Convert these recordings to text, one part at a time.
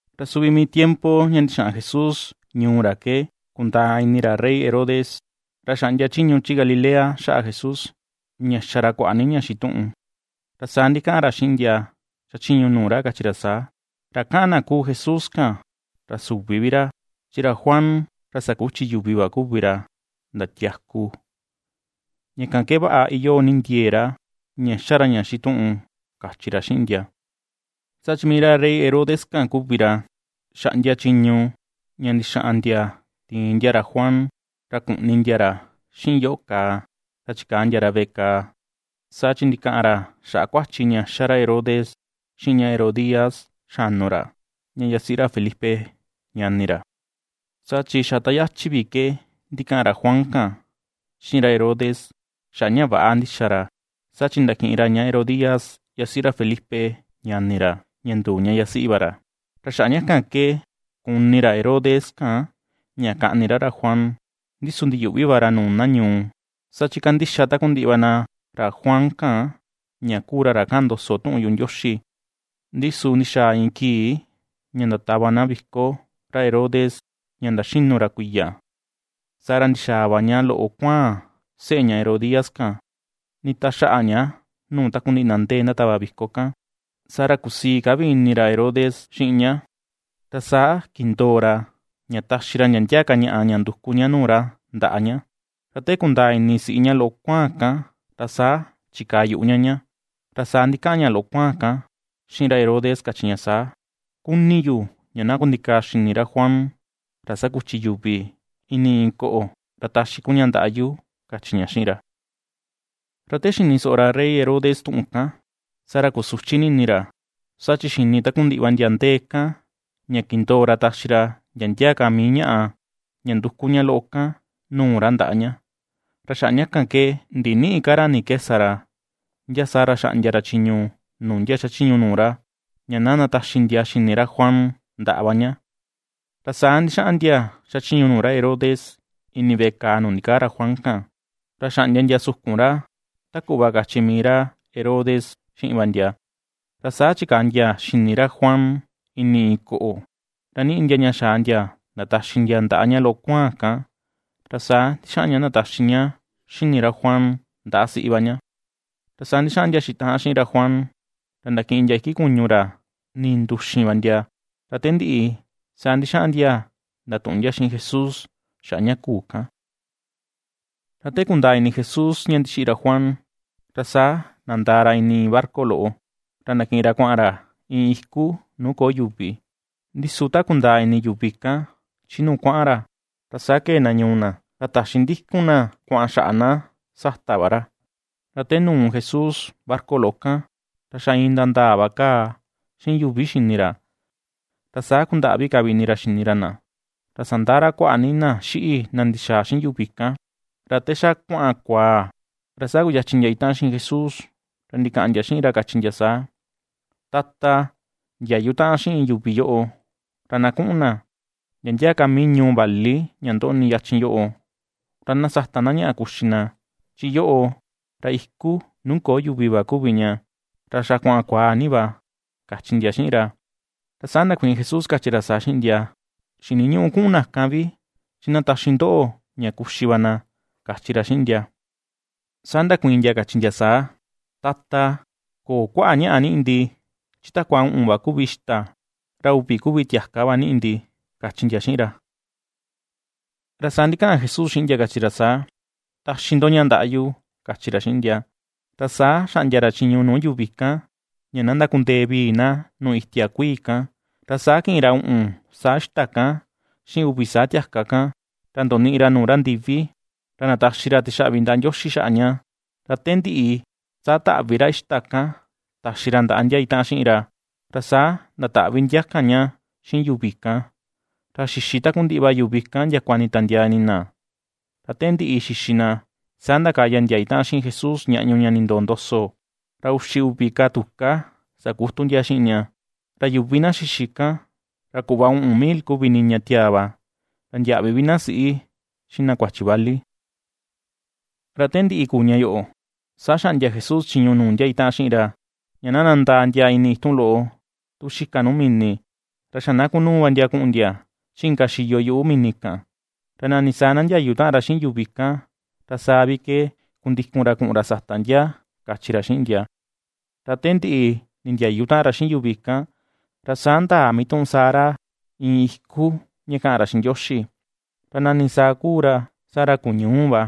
Ra suvi mii tiempo ña ndixaꞌan Jesús ñuu ra ke kundaa ini ra rey Herodes, ra xaꞌndia chiñu chi Galilea xaꞌa Jesús, ña ^xa ra kuaꞌa ni ña xituꞌun. Ra saa ndikaꞌan ra xiꞌin ndia xachiñu nuu ra kachi ra saa: ―Ra kaꞌan na kuu Jesús kan ra süvi vi ra, chi ra Juan ra sakuchi yuvi va kuvi ra ndatiaku. Ña kan ke vaꞌa iyoo ni ndiee ra, ña xa ra ña xituꞌun ―kachi ra xiꞌin ndia. Saa chi mii ra rey Herodes kan kuvi ra xaꞌndia chiñu ña ndixaꞌan ndia tiin ndia ra Juan, ra kuꞌni ndia ra xiꞌin yoꞌo kàà, ra chikaa ndia ra veꞌe kàà, saa chi ndikaꞌan ra xaꞌa kuachi ña ^xa ra Herodes xiꞌin ña Herodías xanu ra, ña yasiꞌi ra Felipe, ñani ra. Saa chi xa ta yachi vi ke ndikaꞌan ra Juan kan, xiꞌin ra Herodes xaꞌa ña väꞌa ndixa ra, saa chi ndakiꞌin ra ña Herodías, yasiꞌi ra Felipe, ñani ra, ra nduu ña yasiꞌi va ra. Ra xaꞌa ña kan ke kuni ra Herodes kan ña kaꞌni ra ra Juan, ndi su ndiyuꞌvi va ra nuu na ñuu; saa chi ^kandixa takundiꞌi va na ra Juan kan, ña kuu ra ra kaꞌan ndoso tuꞌun yuꞌu Ndioxi. Ndi su ndixaa iin kii ña ndatava na viko ra rey Herodes ña ndaxinu ra kuiya, saa ra ndixaa va ña loꞌo kuáa̱n seꞌe ña Herodías kan nditaxaꞌa ña nuu takundiꞌi ndia ndee ndatava viko kan, saa ra kusii ka vi ini ra Herodes xiꞌin ña, ra saa kindoo ra, ña taxi ra ndia ndia ka ñaꞌa ña nduku ña nuu ra ndaꞌa ña. Ra te kundaa ini siꞌi ña loꞌo kuaan kan, ra saa chikaa yuꞌu ña ñá, ra saa ndikaꞌan ña loꞌo kuaan kan xiꞌin ra Herodes kachi ña saa: ―Kuni yu ña na kundikaa xini ra Juan ra sakuchi yuvi ini iin koꞌo ra taxi kun ña ndaꞌa yu ―kachi ña xiꞌin ra. Ra te xini soꞌo ra rey Herodes tuꞌun kan, saa ra kusuchi ni ini ra, saa chi xini takundiꞌi va ndia ndee kan ña kindoo ra taxi ra ndia ndia ka mii ñaꞌa ña nduku ña loꞌo kan nuu ra ndaꞌa ña, ra xaꞌa ña kan ke ndinïꞌi ka ra ni ke sa ra, ndia saa ra xaꞌndia ra chiñu nuu ndia xachiñu nuu ra, ña na ndataxi ndia xini ra Juan ndaꞌa va ña. Ra saa ndixaꞌan ndia xachiñu nuu ra Herodes ini veꞌe kàà nuu ndikaa ra Juan kan, ra xaꞌndia ndia sukun ra, ta kuꞌva kachi mii ra Herodes xiꞌin va ndia. Ra saa chikaa ndia xini ra Juan ini iin koꞌo, ra niꞌi ndia ña xaa ndia ndataxi ndia ndaꞌa ña loꞌo kuaan kan, ra saa ndixaꞌan ña ndataxi ña xini ra Juan ndaꞌa siꞌi va ña. Ra saa ndixaꞌan ndia xitaꞌan xiꞌin ra Juan, ra ndakiꞌin ndia iki kuñu ra ninduxin va ndia. Ra te ndiꞌi saa ndixaꞌan ndia ndatuꞌun ndia xiꞌin Jesús xaꞌa ña kuu kan. Ra ta kundaa ini Jesús ña ndixiꞌi ra Juan, ra saa nandaa ra ini iin barca loꞌo ra ndakiꞌin ra kuaꞌan ra iin iku nuu köo yuvi. Ndi su ta kundaa ini yuvi kan chi nuu kuaꞌan ra, ra saa kee na ñuu na ra taxi ndikun na kuaꞌan xaꞌa na sata va ra. Ra te nuu Jesús barca loꞌo kan, ra xa iin ndandaa va kaa xiꞌin yuvi xini ra, ra saa kundaꞌvi ka vi ini ra xini ra na, ra sandaꞌa ra kuaꞌa ni na xiꞌi na ndixaa xiꞌin yuvi kan. Ra te xa kuaꞌan kuaa, ra saa kuyachin ndia itaꞌan xiꞌin Jesús, ra ndikaꞌan ndia xiꞌin ra kachi ndia saa: ―Tata, ndiayu taꞌan xiꞌin yuvi yoꞌo ra na kuꞌun na ndia ndia ka mii ñuu vali ña ndoꞌni yachin yoꞌo, ra na sata na ñaꞌa kuxi na, chi yoꞌo, ra iku nuu köo yuvi va kuvi ña, ra xa kuaꞌan kuaa ni va ―kachi ndia xiꞌin ra. Ra saa ndakuiin Jesús kachi ra saa xiꞌin ndia: ―Xiniñüꞌu kuꞌun na kan vi, chi na taxi ndoꞌo ña kuxi va na ―kachi ra xiꞌin ndia. Saa ndakuiin ndia kachi ndia saa: ―Tata, köo kuaꞌa ñaꞌa niꞌi ndi, chi takua uꞌun va kuvi ixta, ra uvi kuvi tiaka va niꞌi ndi ―kachi ndia xiꞌin ra. Ra saa ndikaꞌan Jesús xiꞌin ndia kachi ra saa: ―Taxi ndo ña ndaꞌa yu ―kachi ra xiꞌin ndia. Ra saa xaꞌndia ra chiñu nuu yuvi kan ña na ndakundee vii na nuu itia kuii kan, ra saa kiꞌin ra uꞌun saa ixta kan, xiꞌin uvi saa tiaka kan, ra ndoniꞌi ra nuu ra ndivi, ra ndataxi ra tixaꞌvi ndaꞌa Ndioxi xaꞌa ña, ra te ndiꞌi, saa taꞌvi ra ixta kan taxi ra ndaꞌa ndia itaꞌan xiꞌin ra, ra saa ndataꞌvi ndia kan ña xiꞌin yuvi kan. Ra xixi takundiꞌi va yuvi kan ndiakua nditiandiaa ini na. Ra te ndiꞌi xixi na, saa ndakaya ndia itaꞌan xiꞌin Jesús ñaꞌñu ña nindoo ndoso, ra uxi uvi ka tuká sakutu ndia xiꞌin ña. Ra yuvi na xixi kan, ra kuꞌva uꞌun mil kuvi niña tiaa va, ra ndiäꞌvi vi na siꞌi, xiꞌin na kuachi vali. Te ndiꞌi kuu ña yoꞌo, saa xaꞌndia Jesús chiñu nuu ndia itaꞌan xiꞌin ra, ña na nandaa ndia ini itun loꞌo tu xika nuu mini, ra xa na kunuu va ndia kuꞌun ndia chi inka xiyo yuꞌu mini kan, ra nani saa na ndiayu taꞌan ra xiꞌin yuvi kan ra saa vi ke kundikun ra kuꞌun ra sata ndia, kachi ra xiꞌin ndia. Ra te ndiꞌi nindiayu taꞌan ra xiꞌin yuvi kan, ra saa ndaa mituꞌun saa ra iin iku ña kaꞌan ra xiꞌin Ndioxi, ra nani saa kuu ra saa ra kuu ñuu va.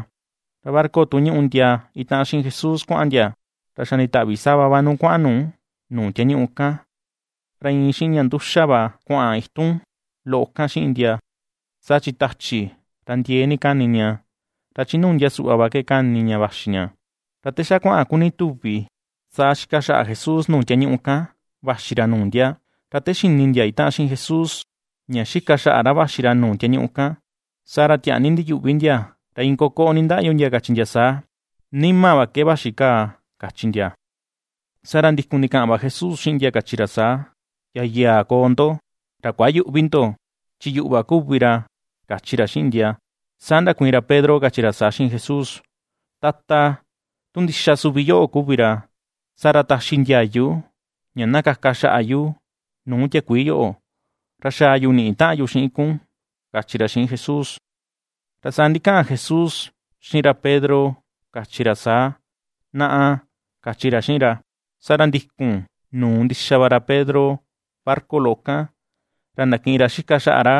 Ra barca tu ñuꞌu ndia itaꞌan xiꞌin Jesús kuaꞌan ndia, ra xa nditaꞌvi sava va nuu kuaꞌan nu nuu tiañuꞌu kan, ra iin xiꞌin ña nduxa va kuaꞌan itu loꞌo kan xiꞌin ndia, saa chi tachi ra ndiee ni kani ña ra chi nuu ndia suꞌva va ke kani ña vaxi ña. Ra te xa kuaꞌan kuni tuvi, saa xika xaꞌa Jesús nuu tiañuꞌu kan vaxi ra nuu ndia. Ra te xini ndia itaꞌan xiꞌin Jesús ña xika xaꞌa ra vaxi ra nuu tiañuꞌu kan, saa ra tiaa ni ndiyuꞌvi ndia, ra iin kokoꞌo nindaꞌyu ndia, kachi ndia saa: ―¡Nima va ke vaxi kaa! ―kachi ndia. Saa ra, ndikun ndikaꞌan va Jesús xiꞌin ndia kachi ra saa: ―¡Yayaa koo ndo! ra ¡Kuayüꞌvi ndo!, chi yuꞌu va kuvi ra ―kachi ra xiꞌin ndia. Saa ndakuiin ra Pedro kachi ra saa xiꞌin Jesús: ―Tata, tu ndixa suvi yoꞌo kuvi ra, saa ra, taxi ndiayu ña na kaka xaꞌa yu nuu tiakuii yoꞌo, ra xaa yu niꞌi taꞌan yu xiꞌin kun ―kachi ra xiꞌin Jesús. Ra saa ndikaꞌan Jesús xiꞌin ra Pedro kachi ra saa: ―Naꞌa ―kachi ra xiꞌin ra. Saa ra ndikun nuu ndixa va ra Pedro barca loꞌo kan, ra ndakiꞌin ra xika xaꞌa ra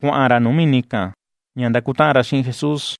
kuaꞌan nuu mini kan, ña ndakutaꞌan ra xiꞌin Jesús.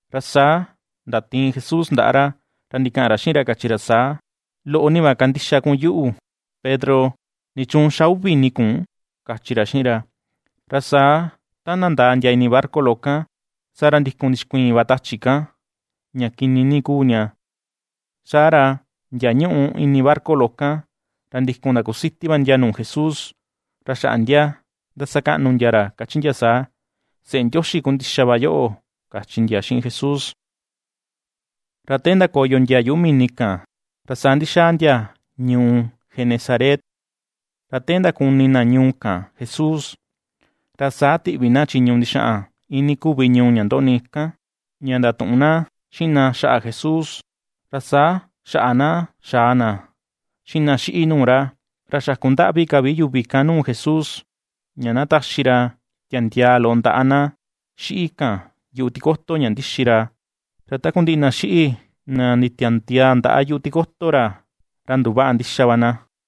Ra saa ndatiin Jesús ndaꞌa ra, ra ndikaꞌan ra xiꞌin ra kachi ra saa: ―Loꞌo ni va kandixa kun yuꞌu, Pedro. ¿Nichuun ^xa uvi ini kun? ―kachi ra xiꞌin ra. Ra saa ta nandaa ndia ini barca loꞌo kan, saa ra ndikun ndixkuiin va tachi kan, ña kini ni kuu ña. Saa ra ndia ñuꞌu ini barca loꞌo kan, ra ndikun ndakusiti va ndia nuu Jesús, ra xaꞌa ndia ^ndasakaꞌnu ndia ra kachi ndia saa: ―Seꞌe Ndioxi ku ndixa va yoꞌo ―kachi ndia xiꞌin Jesús. Ra te ndakoyo ndia yuꞌu mini kan, ra saa ndixaa ndia ñuu Genesaret. Ra te ndakuni na ñuu kan Jesús, ra saa tiꞌvi na chiñu ndixaꞌan iinii kuvi ñuu ña ndoꞌni kan, ña ndatuꞌun na xiꞌin na xaꞌa Jesús, ra saa xaꞌa na xaa na xiꞌin na xíꞌi̱ nuu ra, ra xakundaꞌvi ka vi yuvi kan nuu Jesús, ña na taxi ra tiandiaa loꞌo ndaꞌa na xíꞌi̱ kan yuꞌu tikoto ña ndixi ra; ra takundiꞌi na xíꞌi̱ na nditiandiaa ndaꞌa yuꞌu tikoto ra, ra nduvaꞌa ndixa va na.